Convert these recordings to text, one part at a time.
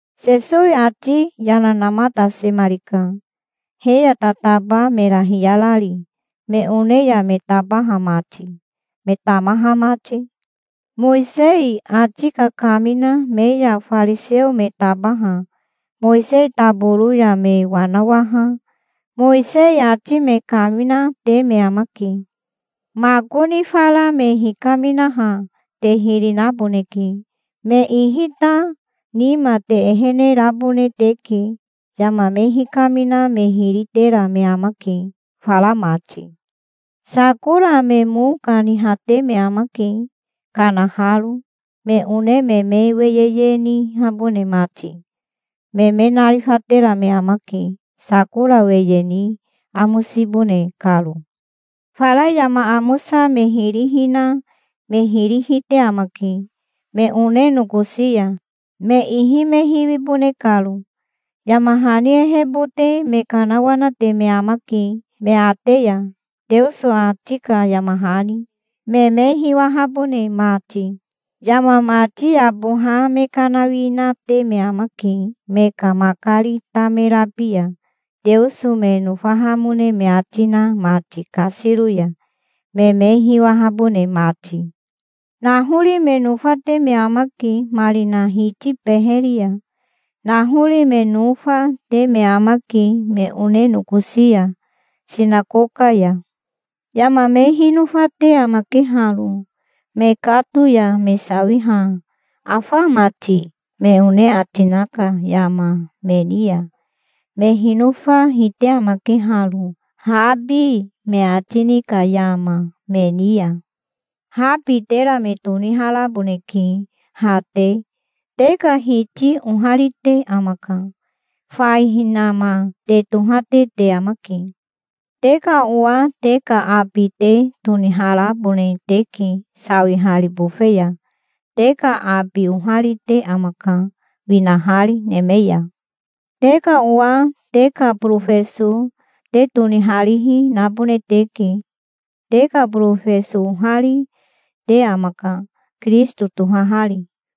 Sesowi ati yana namatasemarika, he ya tataba mera hiyarari, me one ya me tabaha mati, me tamaha mati. "Mowisei ati kakamina me ya fariseo me tabaha Mowisei taboro ya me wanawaha Mowisei ati me kaminate me amake. Makoni fara me hikaminaha te hiri naboneke. Me ihi ta nima te ehene rabone teke. Yama me hikamina me hiri tera me amake, fara mati. Sakora me mo kanihate me amake, kanaharo, me one me me weyeye nihabone mati. Me me narifatera me amake, sakora weye ni amosibone karo. Fara yama amosa me hiri hina me hiri hite amake, me one nokosi ya, me ihi me hiwibone karo. Yama hani ehebote me kanawanate me amake me ate ya, Teoso ati ka yama hani, me me hiwahabone mati. Yama mati yaboha me kanawinate me amake me ka makari tamerabi ya, Teoso me nofahamone me ati na mati kasiro ya, me me hiwahabone mati. Nahori me nofate me amake marina hiti beheri ya. Nahori me nofa, te me amake me one nokosi ya, sinakoka ya. Yama me hinofate amake haro, mekato ya me sawiha 'Afa ama ti?' me one ati na ka yama me ni ya. Me hinofa hite amake haro, 'Habi', me ati ni ka yama, me ni ya". "Habi tera me toniharaboneke, ha te. Te ka Hiti oharite amaka. Fai hinama te tohate te amake. Te ka owa te ka abi te toniharabone teke, sawihari bofe ya. Te ka abi oharite amaka, winahari neme ya. Te ka owa te ka borofeso te toniharihi nabone teke. Te ka borofeso ohari, te amaka, Kirisito tohahari.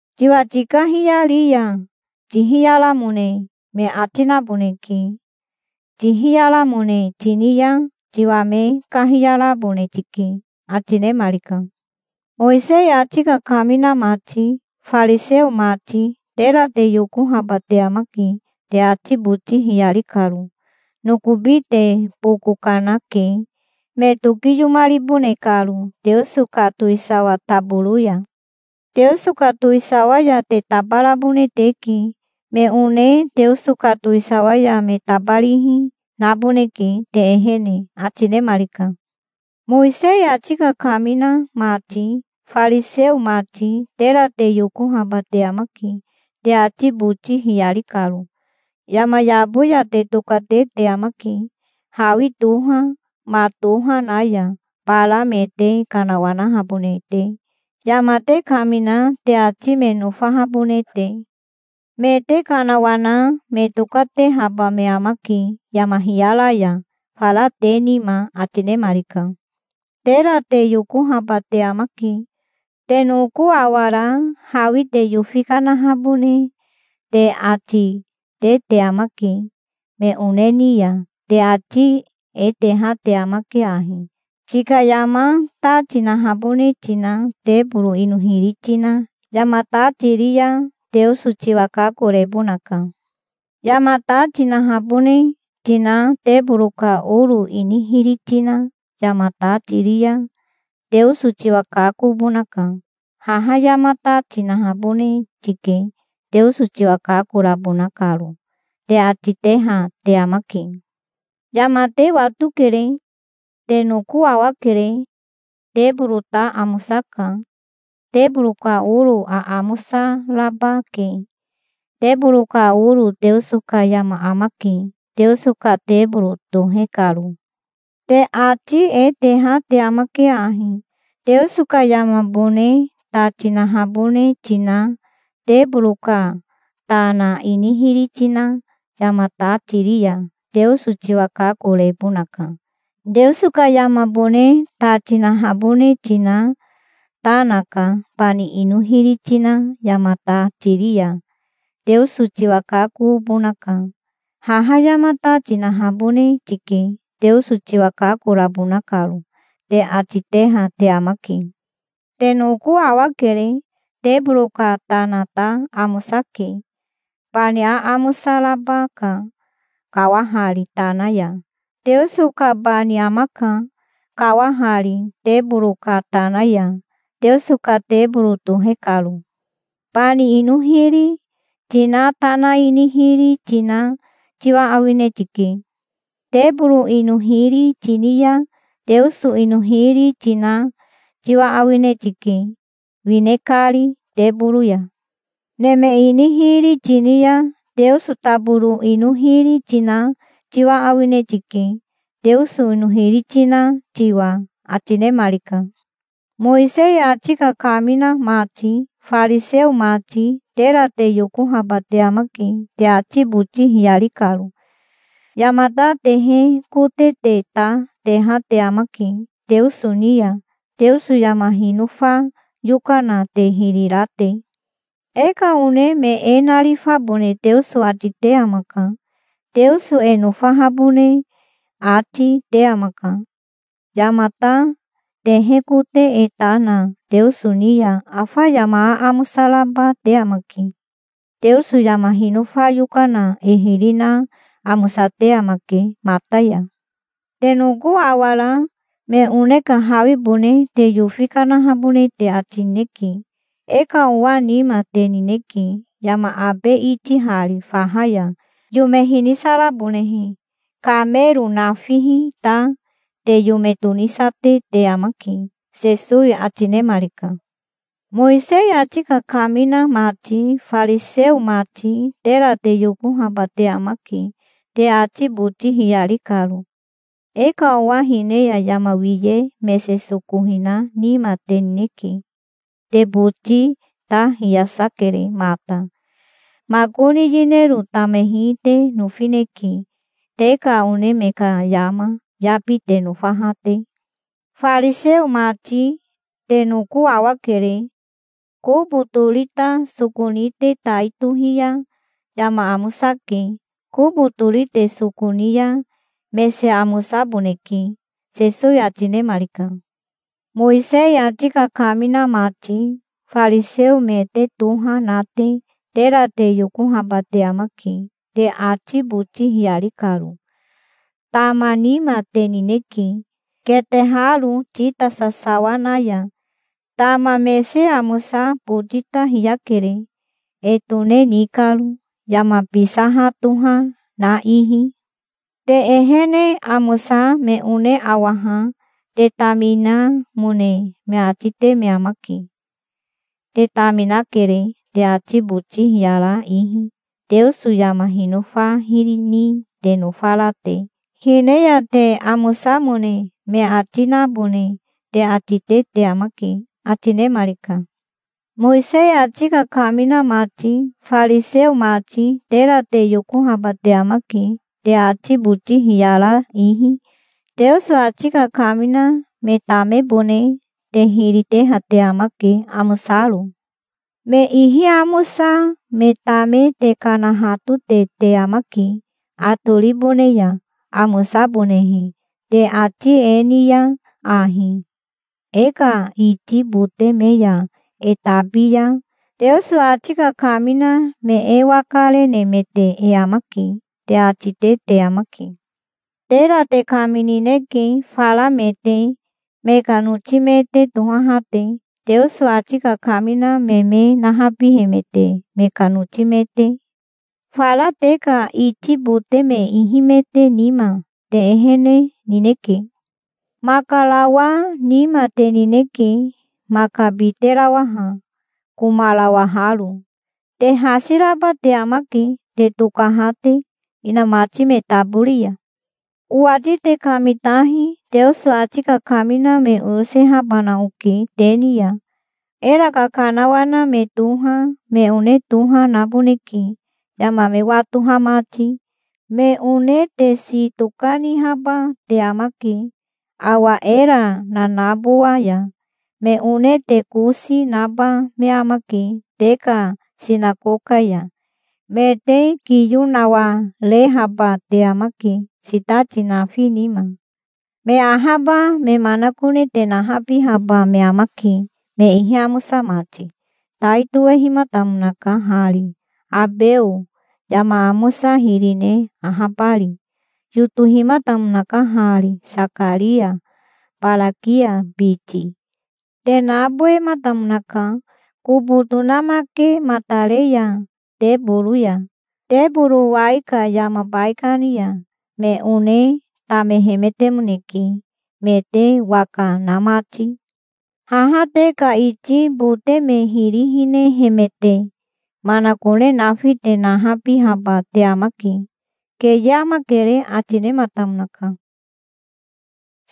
Tiwa tikahiyari ya tihiyaramone me ati naboneke. Tihiyaramone tini ya tiwa me kahiyarabone tike", ati nemarika. "Mowisei ati kakamina mati, fariseo mati. Tera te yokohaba te amake, te ati boti hiyari karo. Nokobi te boko kanake, me tokiyomaribone karo Teoso ka towisawa taboro ya. Teoso ka towisawa ya te tabarabone teke. Me one Teoso ka towisawa ya me tabarihi, naboneke te ehene", ati nemarika. "Mowisei ati kakamina mati, fariseo mati. Tera te yokohaba te amake, te ati boti hiyari karo. Yama yabo ya te tokate te amake, hawi toha, ma toha na ya, bara me te kanawanahabone te, yama te kamina te ati me nofahabone te. Me te kanawana me tokatehaba me amake yama hiyara ya, fara te nima", ati nemarika. "Tera te yokohaba te amake. Te noko awara hawi te yofi kanahabone te ati te te amake me one ni ya. Te ati e teha te amake ahi: 'Tika yama ta tinahabone tina teboro ino hiri tina yama ta tiri ya Teoso tiwa kakorebonaka. Yama ta tinahabone tina teboro ka oro ini hiri tina yama ta tiri ya Teoso tiwa kakobonaka. Haha yama ta tinahabone tike, Teoso tiwa kakorabona karo', te ati teha te amake. Yama te watokere. Te noko awakere. Teboro ta amosaka. Teboro ka oro aamosa raba ke. Teboro ka oro Teoso ka yama amake, Teoso ka teboro tohe karo. Te ati e teha te amake ahi: 'Teoso ka yamabone ta tinahabone tina teboro ka tana ini hiri tina yama ta tiri ya Teoso tiwa kakorebonaka. Teoso ka yamabone ta tinahabone tina tana ka bani ino hiri tina yama ta tiri ya Teoso tiwa kakobonaka. Haha yama ta tinahabone tike, Teoso tiwa kakorabona karo', te ati teha te amake. Te noko awakere. Teboro ka tana ta amosake. Bani aamosa raba ka, kawahari tana ya. Teoso ka bani amaka, kawahari teboro ka tana ya, Teoso ka teboro tohe karo. Bani ino hiri tina tana ini hiri tina tiwa awine tike. Teboro ino hiri tini ya Teoso ino hiri tina tiwa awine tike, wine kari teboro ya. Neme ini hiri tini ya Teoso taboro ino hiri tina tiwa awine tike, Teoso ino hiri tina tiwa", ati nemarika. "Mowisei ati kakamina mati, fariseo mati. Tera te yokohaba te amake, te ati boti hiyari karo. Yamata tehe kote te ta teha te amake Teoso ni ya, Teoso yama hinofa yokana te hiri ra te. E ka one me e narifabone Teoso ati te amaka. Teoso e nofahabone ati, te amaka. Yamata tehe kote e ta na Teoso ni ya afa yama aamosa raba te amake. Teoso yama hinofa yokana e hiri na amosate amake mata ya. Te noko awara me one ka hawibone te yofi kanahabone te ati nineke. E ka owa nima te nineke, yama abe itihari faha ya, yome hinisarabonehe. Kamero nafihi ta te yome tonisate te amake", Sesowi ati nemarika. "Mowisei ati kakamina mati, fariseo mati. Tera te yokahaba te amake, te ati boti hiyari karo. E ka owa hine ya yama wiye mese soko hina nima te nineke. Te boti ta hiyasa kere mata. Makoni yinero tamehi te nofineke, te ka one me ka yama yabi te nofaha te. Fariseo mati. Te noko awakere. Kobo tori ta soko ni te tai tohi ya yama amosake. Kobo tori te soko ni ya mese amosaboneke", Sesowi ati nemarika. "Mowisei ati kakamina mati, fariseo me te toha na te. Tera te yokohaba te amake, te ati boti hiyari karo. Tama nima te nineke, keteharo tita sasawa na ya. Tama mese amosa boti ta hiyakere, e tone ni karo, yama bisaha toha na ihi. Te ehene amosa me one awaha te taminamone me ati te me amake. Te taminakere, te ati boti hiyara ihi, Teoso yama hinofa hiri ni te nofara te. Hine ya te amosamone me ati nabone te ati te te amake", ati nemarika. "Mowisei ati kakamina mati, fariseo mati. Tera te yokohaba te amake, te ati boti hiyara ihi. Teoso ati kakamina me tamebone te hiri teha te amake, amosaro. Me ihi amosa me tame te kanahatote te amake atoribone ya, amosabonehe, te ati e ni ya ahi: 'E ka iti bote me ya e tabi ya, Teoso ati kakamina me e waka renemete e amake', te ati te te amake. Tera te kaminineke fara me te, me ka noti me te tohaha te, Teoso ati kakamina me me nahabihemete me ka noti me te. Fara te ka iti bote me ihimete nima te ehene nineke. Makarawa nima te nineke, maka biterawaha, komarawaharo. Te hasi raba te amake, te tokaha te inamati me tabori ya". "Owati te kamitahi. Teoso ati kakamina me oyosehabana oke te ni ya. Era kakanawana me toha, me one toha, naboneke, yama me watoha mati. Me one te waka naba me amake. Me one te si tokanihaba te amake awa era nanabowa ya. Me one te kosi naba me amake te ka sinakoka ya. Me te kiyo nawarehaba te amake sitati nafi nima. Me ahaba me manakone te nahabihaba me amake, me ihi amosa mati. Tai tohehimatamonaka hari, Abeo, yama amosa hiri ne ahabari. Yotohimatamonaka hari, Sakaria, Barakia biti. Te nabowematamonaka, kobo tonamakematare ya teboro ya, teboro wai ka yama baikani ya. Me one tamehemetemoneke me te waka na mati. Haha te ka iti bote me hiri hinehemete manakone nafi te nahabihaba te amake. Keye amakere", ati nematamonaka.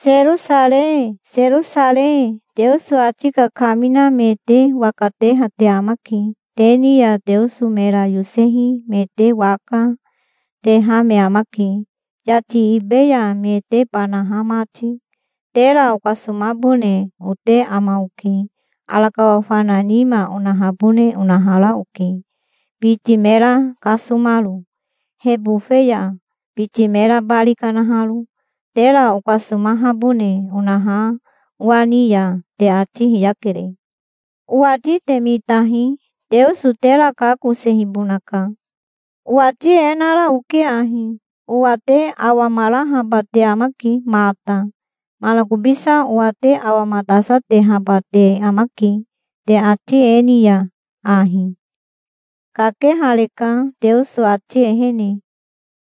"Serosarei, Serosarei. Teoso ati kakamina me te waka teha te amake. Te ni ya Teoso mera yosehi me te waka, teha me amake, yati ibe ya me te banaha mati. Tera okasomabone ote ama oke. Arakawa fana nima onahabone onahara oke, biti mera kasomaro he bofe ya, biti mera bari kanaharo. Tera okasomahabone onaha owa ni ya te ati hiyakere. Owati te mitahi. Teoso tera kakosehibonaka. Owati e nara oke ahi: Owa te awamarahaba te amake mata. Manakobisa owa te awamatasatehaba te amake, te ati e ni ya ahi: 'Kakehareka Teoso ati ehene.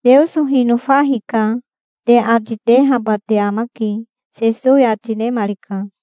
Teoso hinofa hika', te ati tehaba te amake", Sesowi ati nemarika.